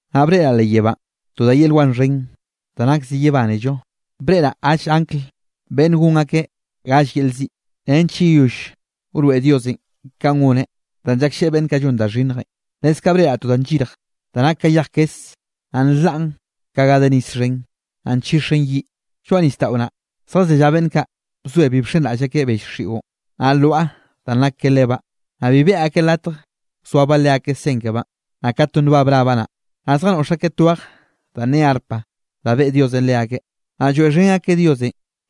Naꞌ breꞌraꞌ leꞌ yebánꞌ to da yel wan xhen da nak zi yebánello. Breꞌraꞌ galle angl beꞌnne gon akeꞌ gall yel ziꞌ, nench yeyoll wroeꞌ Diosenꞌ ka goneꞌ danꞌ llaklleꞌe beꞌnn kaꞌ llon da xhinnjenꞌ. Leskaꞌ breꞌraꞌ to da nllirj da nak ka yej kes, naꞌ nlaꞌn ka ga de nis xhen, naꞌ nchixen yiꞌ. Lloaꞌ nisdaꞌo naꞌ, zjazellá beꞌnn kaꞌ bzoe bi bxenraꞌll akeꞌ bell xiꞌon, naꞌ lwaꞌa danꞌ nak ka lebaꞌ, naꞌ bi beꞌe akeꞌ latje wzoabaꞌ leakeꞌ sen kebaꞌn, naꞌ ka to nbab rabaꞌ naꞌ. Naꞌ zjanoꞌx akeꞌ tweje danꞌ ne arpa da beꞌe Diosenꞌ leakeꞌ. Naꞌ lloeꞌxhen akeꞌ Dios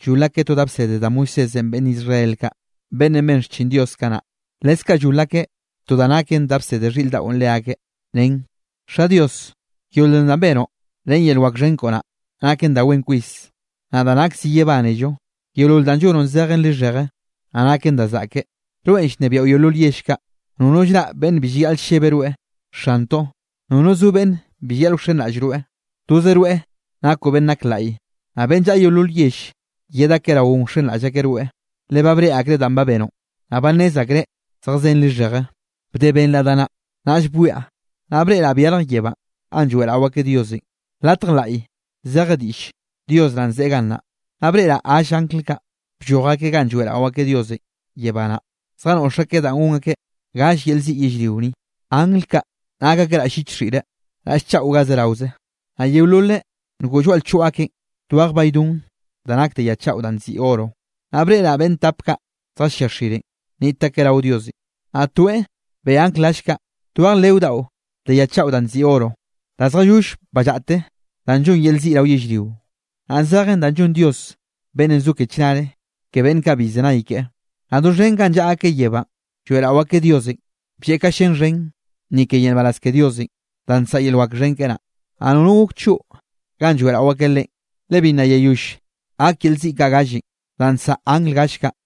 llol akeꞌ to da bsede da Moisésenꞌ beꞌnn Israel kaꞌ, beꞌnnenꞌ ben xchin Dios kanaꞌ. Leskaꞌ llol akeꞌ to da naken da bsede xhiꞌr daꞌo leakeꞌ, nen: Xa, Dios, yeolol danꞌ benoꞌ ren yel wak xhen koꞌo naꞌ, naken da wen kwis, naꞌ da nak zi yebánello. Yeolol danꞌ llonoꞌn zejen lixheje, naꞌ naken da zaꞌke. Rweꞌn llnebiaꞌo yeolol yell kaꞌ. Nono llraꞌ beꞌnn bi llayaꞌl llebe rweꞌ, Xantoꞌ. Nono zo beꞌnn bi llayaꞌl wxenraꞌll rweꞌ. Toze rweꞌ nakoꞌ beꞌnn nak laꞌy. Naꞌ beꞌnn llaꞌa yeolol yell, yed akeꞌ raoꞌn wxenraꞌll akeꞌ rweꞌ, le ba breꞌe akreꞌ danꞌ ba benoꞌ, naꞌ ba nnez akreꞌ zejkzen lixheje. Bde benraꞌ da naꞌ, naꞌll bwiaꞌ, naꞌ breꞌraꞌ byarj yebánꞌ ganꞌ lloeꞌrao akeꞌ Diosenꞌ, latj laꞌy zeje diꞌll Dios naꞌn ze gannaꞌ. Naꞌ breꞌraꞌ gall angl kaꞌ, blloj akeꞌ ganꞌ lloeꞌrao akeꞌ Diosenꞌ yebá naꞌ, zjanoꞌx akeꞌ da gon akeꞌ galle yel ziꞌ yellrio ni. Angl kaꞌ nak akeꞌ raꞌll lliche xhiꞌre, raꞌll chaꞌo ga zeraoze, naꞌ yeololeꞌ ngoꞌ lloaꞌ lchoꞌ akeꞌ twej baydon da nak de ya chaꞌo danꞌ nziꞌi oro. Naꞌ breꞌraꞌ beꞌnn tap kaꞌ zjallia xirenꞌ, niꞌt akeꞌ rao Diosenꞌ, naꞌ toeꞌ beꞌe angl gall kaꞌ twej leo daꞌo de ya chaꞌo danꞌ nziꞌi oro, da zjayoll ballaꞌte da llon yel ziꞌ rao yellrionꞌ, naꞌ zejen da llon Dios beꞌnnenꞌ zo ke chnare ke beꞌnn kaꞌ bi llzenay keꞌe. Naꞌ doxhen ganꞌ llaꞌa akeꞌ yebánꞌ, lloeꞌrao akeꞌ Diosenꞌ blleꞌ ka llén xhen ni ke yel nbaraz ke Diosenꞌ, da nsaꞌa yel wak xhen keꞌe naꞌ, naꞌ nono gok choꞌ ganꞌ lloeꞌrao akeꞌ Leꞌen, le bi nna yeyoll gak yel ziꞌ kaꞌ gallenꞌ danꞌ nsaꞌa angl gall kaꞌ.